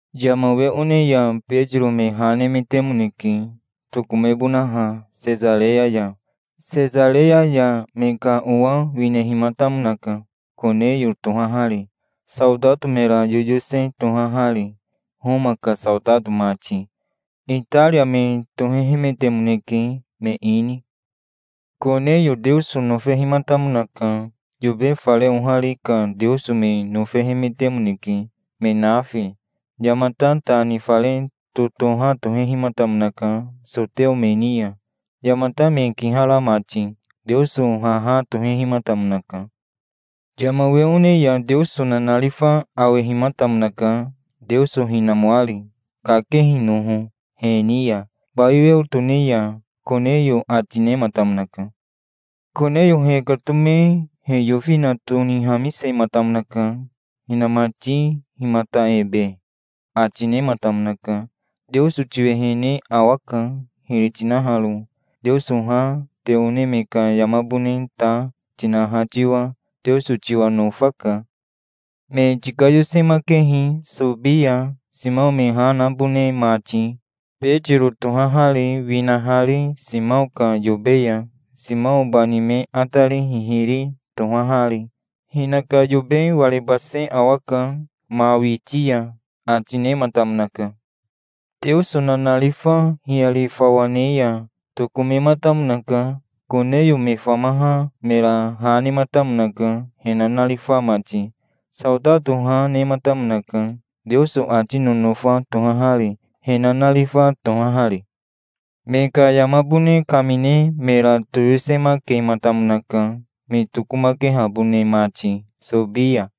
Yama we one ya Betiro me ha nemetemoneke, tokomebonaha Sesareya ya. Sesareya ya me ka owa winehimatamonaka, Koneyo tohahari, saotato mera yoyose tohahari, Homa ka saotato mati. Itaria me tohehemetemoneke, me ini. Koneyo Teoso nofehimatamonaka. Yobe fare ohari ka Teoso me nofehemetemoneke, me nafi. Yamata ta ni fare totoha tohehimatamonaka soteo me ni ya, yamata me kihara mati. Teoso haha tohehimatamonaka. Yama we one ya Teoso nanarifa awehimatamonaka, Teoso hinamoari, kakehinoho he ni ya, bai weo tone ya. "Koneyo", ati nematamonaka. Koneyo hekatome he yofina tonihamisematamonaka. "Hinamati himata ebe?" ati nematamonaka. "Teoso tiwehene awaka, hiri tinaharo, Teoso ha, te one me ka yamabone ta, tinaha tiwa. Teoso tiwa nofaka. Me tikayosemakehi Sobi ya, Simao me ha nabone mati, Betiro tohahari, winahari Simao ka yobe ya, Simao bani me atari hihiri tohahari. Hinaka yobe warebase awaka ma witi ya", ati nematamonaka. Teoso nanarifa hiyari fawa ne ya tokomematamonaka. Koneyo me famaha mera ha nematamonaka, he nanarifa mati. Saotato ha, nematamonaka, Teoso ati nonofa tohahari, he nanarifa tohahari. Me ka yamabone kamine mera toyosemakematamonaka, me tokomakehabone mati Sobi ya.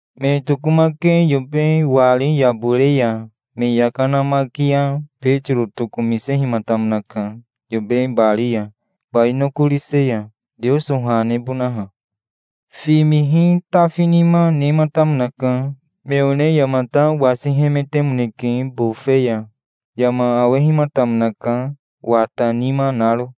Me tokomake yobe wari yabore ya me yaka namaki ya Betiro tokomisehimatamonaka yobe bari ya, bai nokorise ya, Teoso ha nebonaha. Fimihi tafinima nematamonaka. Me one yamata wasihemetemoneke bofe ya. Yama awehimatamonaka, wata nima naro.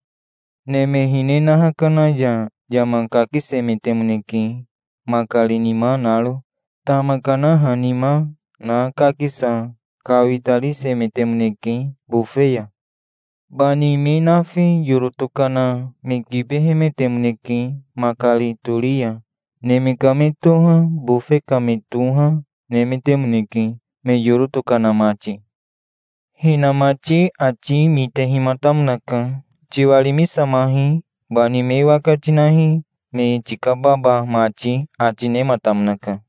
Neme hine naha kana ya yama kakisemetemoneke, makari nima naro. Tama kanaha nima na kakisa kawitarisemetemoneke bofe ya. Bani me nafi yoro tokana me kibehemetemoneke makari tori ya. Neme ka me toha, bofe ka me toha, nemetemoneke, me yoro tokana mati. Hinamati ati mitehimatamonaka. "Tiwarimisamahi. Bani me waka tinahi, me tikababa mati", ati nematamonaka.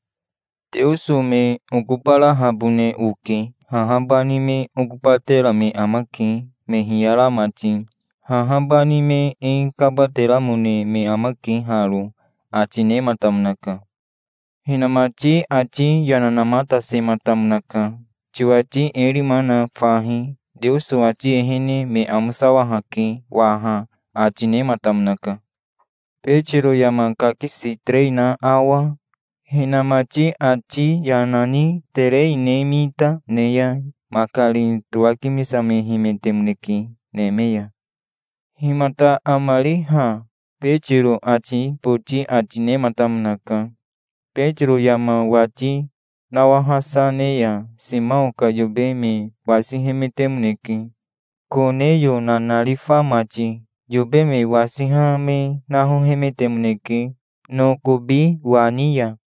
"Teoso me okobarahabone oke. Haha bani me okobatera me amake, me hiyara mati. Haha bani me e kabateramone me amake haro", ati nematamonaka. Hinamati ati yana namatasematamonaka. "Tiwati e rima na fahi. Teoso ati ehene me amosawahake waha", ati nematamonaka. Betiro yama kakisi terei na awa, hinamati ati yana ni terei ne mita, ne ya makari towakimisamehemetemoneke neme ya. "Himata amari ha?" Betiro ati boti ati nematamonaka. Betiro yama wati nawahasa ne ya Simao ka yobe me wasihemetemoneke, Koneyo nanarifa mati. Yobe me wasiha me nahohemetemoneke nokobi wani ya.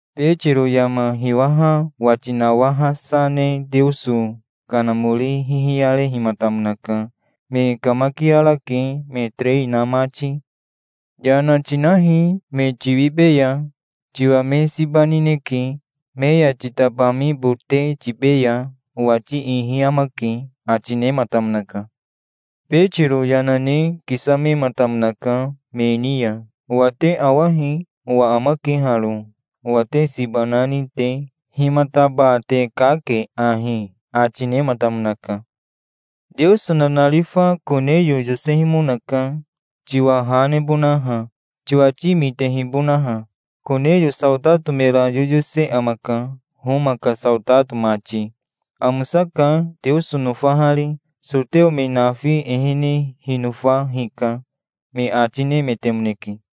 Betiro yama hiwaha wati nawahasa ne Teoso Kanamori hihiyarehimatamonaka. "Me kamakiarake, me terei na mati. Yana tinahi. Me tiwibeya. Tiwa me siba nineke. Me ya titabamibote tibeya. Owati ihi amake", ati nematamonaka. Betiro yana ne kisamematamonaka me ni ya. "Owa te awahi. Owa amake haro, owa te siba nani te. Himataba te kake ahi?" ati nematamonaka. "Teoso nanarifa Koneyo yosehimonaka, tiwa ha nebonaha, tiwati mitehibonaha. Koneyo saotato mera yoyose amaka, Homa ka saotato mati. Amosaka, Teoso nofahari. Soteo me nafi ehene hinofa hika", me ati nemetemoneke.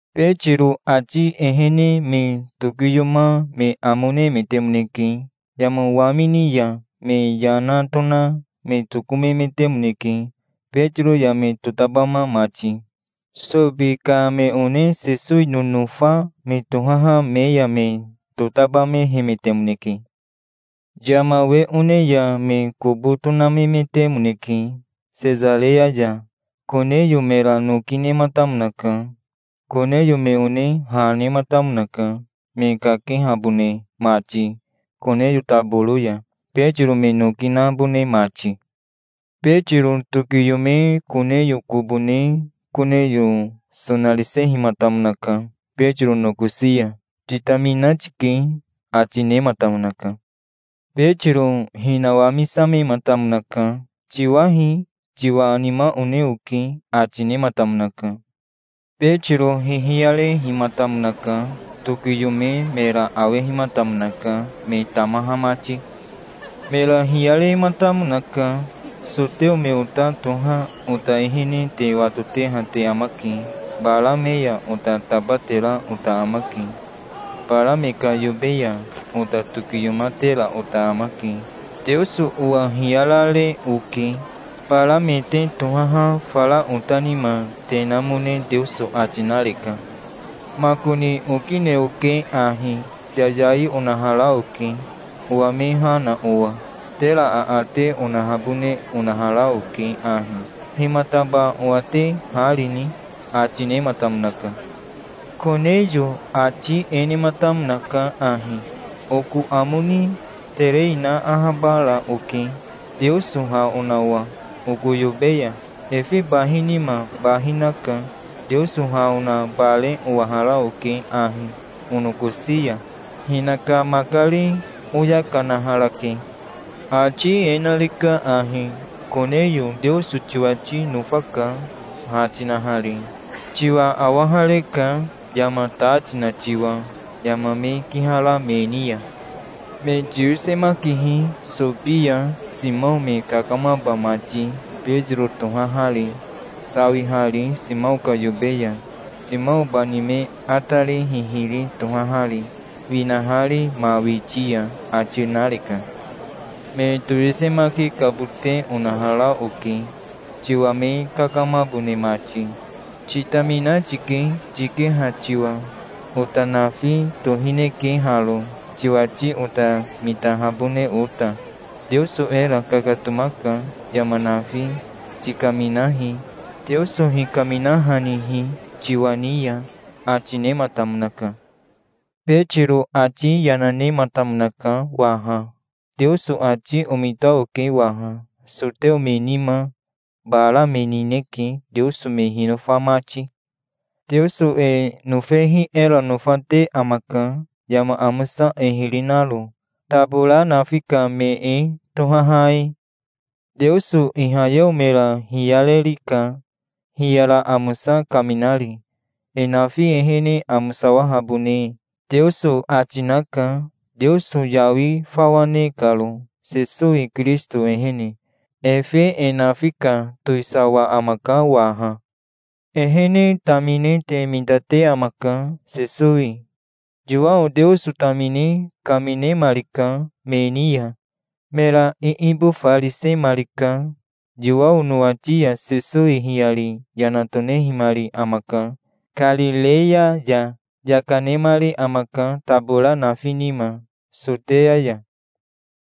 Betiro ati ehene me tokiyoma me amo nemetemoneke. Yama wamini ya me yana tona me tokomemetemoneke, Betiro ya me totabama mati. Sobi ka me one Sesowi nonofa me tohaha me ya me totabamehemetemoneke. Yama we one ya me kobo tonamemetemoneke Sesareya ya. Koneyo mera noki nematamonaka. Koneyo me one ha nematamonaka, me kakehabone mati Koneyo taboro ya, Betiro me noki nabone mati. Betiro tokiyome Koneyo kobo ne Koneyo sonarisehimatamonaka Betiro nokosi ya. "Titamina tike', ati nematamonaka. Betiro hinawamisamematamonaka. "Tiwahi. Tiwa nima one oke", ati nematamonaka. Betiro hihiyarehimatamonaka. Tokiyome mera awehimatamonaka, me tamaha mati. Mera hiyarematamonaka. "Soteo me ota toha ota ehene te watoteha te amake. Bara me ya ota tabatera ota amake. Bara me ka yobe ya ota tokiyomatera ota amake. Teoso owa hiyarare oke. Bara me te tohaha fara ota nima te namone Teoso ati nareka. Makoni okine oke ahi. Yayai onahara oke, owa me ha na owa. Tera aate onahabone onahara oke ahi. Himataba owa te ha rini?" ati nematamonaka. Koneyo ati e nematamonaka ahi: "Oko amo ni terei na ahabara oke, Teoso ha ona owa oko yobe ya. Efe bahi nima bahi naka. Teoso ha ona bare owahara oke ahi onokosi ya. Hinaka makari oya kanaharake. Ati e nareka ahi: 'Koneyo Teoso tiwati nofaka, ha tinahari. Tiwa awahareka, yama ta tina tiwa, yama me kihara me ni ya. Me tiyosemakihi Sobi ya, Simao me kakamaba mati, Betiro tohahari, sawihari Simao ka yobe ya, Simao bani me atari hihiri tohahari, winahari ma witi ya', ati nareka. Me toyosemakikabote onahara oke, tiwa me kakamabone mati. Titamina tike, tikeha tiwa. Ota nafi tohineke haro, tiwati ota mitahabone ota. Teoso era kakatomaka. Yama nafi tikaminahi, Teoso hikaminahanihi tiwa ni ya", ati nematamonaka. Betiro ati yana nematamonaka waha. "Teoso ati omita oke waha. Soteo me nima bara me nineke, Teoso me hinofa mati. Teoso e nofehi era nofate amaka, yama amosa e hiri naro, tabora nafi ka me e tohaha e. Teoso ihayeo mera hiyarerika, hiyara amosa kaminari. E nafi ehene amosawahabone Teoso ati naka, Teoso yawi fawa ne karo, Sesowi Kirisito ehene. Efe e nafi ka towisawa amaka waha. Ehene tamine te mitate amaka, Sesowi. Yowao Teoso tamine kaminemarika me ni ya. Mera iibofarisemarika. Yowao nowati ya Sesowi hiyari yana tonehimari amaka Karireya ya. Yaka nemari amaka tabora nafi nima, Soteya ya.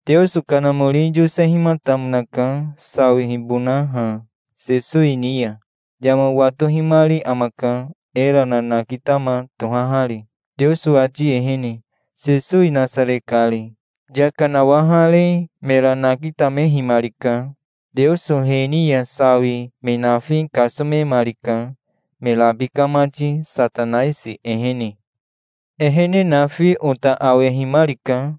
Teoso Kanamori yosehimatamonaka, sawihibonaha Sesowi ni ya. Yama watohimari amaka, era nanakitama tohahari, Teoso ati ehene, Sesowi Nasare kari. Yaka nawahare mera nakitamehimarika. Teoso he ni ya sawi me nafi kasomemarika, me rabika mati, Satanaisi ehene. Ehene nafi ota awehimarika,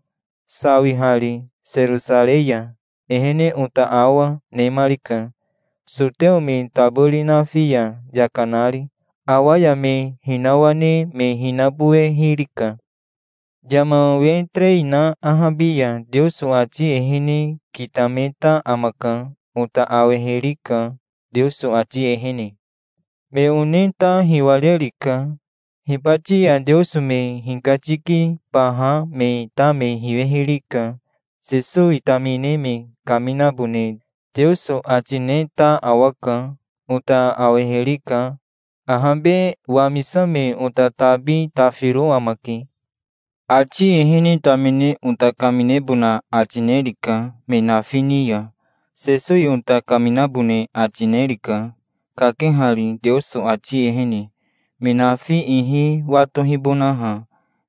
sawihari Serosarei ya. Ehene ota awa, nemarika, soteo me tabori nafi ya yaka nari". "Awa ya me hinawane me hinabowehirika. Yama we terei na ahabi ya Teoso ati ehene kitameta amaka. Ota awehirika, Teoso ati ehene. Me one ta hiwarerika. Hibati ya Teoso me hikatikibaha me ta me hiwehirika. Sesowi tamine me kaminabone Teoso ati neta awaka. Ota awehirika. Ahabe wamisame ota tabi tafiro amake. Ati ehene tamine ota kaminebona ati nerika, me nafi ni ya. Sesowi ota kaminabone ati nerika, kakehari Teoso ati ehene, me nafi ihi watohibonaha,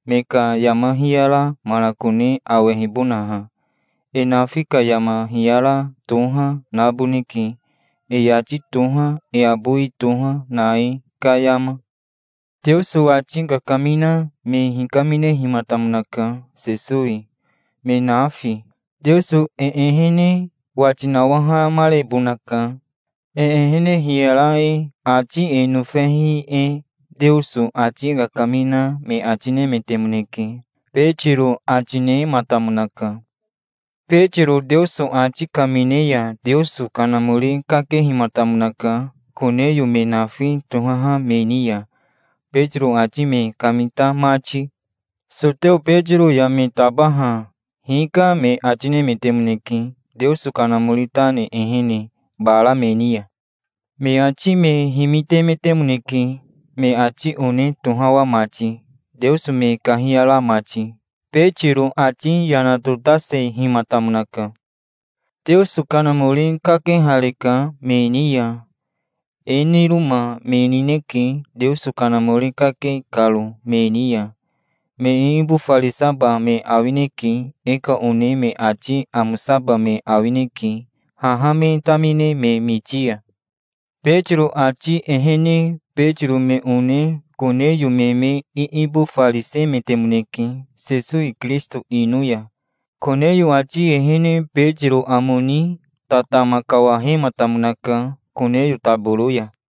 me ka yama hiyara manakone awehibonaha. E nafi ka yama hiyara toha naboneke, e yati toha, e abowi toha, na e ka yama. Teoso ati kakamina me hikaminehimatamonaka, Sesowi, me nafi. Teoso e ehene wati nawahamarebonaka, e ehene hiyara e, ati e nofehi e, Teoso ati kakamina me ati nemetemoneke", Betiro ati nematamonaka. Betiro Teoso ati kamine ya Teoso Kanamori kakehimatamonaka Koneyo me nafi tohaha me ni ya, Betiro ati me kamita mati. Soteo Betiro ya me tabaha "Hika", me ati nemetemoneke, Teoso Kanamori ta ne ehene, bara me ni ya. Me ati me himitemetemoneke, me ati one tohawa mati, Teoso me kahiyara mati. Betiro ati yana totasehimatamonaka. "Teoso Kanamori kakehareka me ni ya. E niroma me nineke, Teoso Kanamori kake karo me ni ya. Me iibofarisaba me awineke. E ka one me ati amosaba me awineke, haha me tamine me miti ya". Betiro ati ehene Betiro me one Koneyo me me iibofarisemetemoneke, Sesowi Kirisito ino ya. Koneyo ati ehene Betiro amo ni tatama kawahematamonaka Koneyo taboro ya.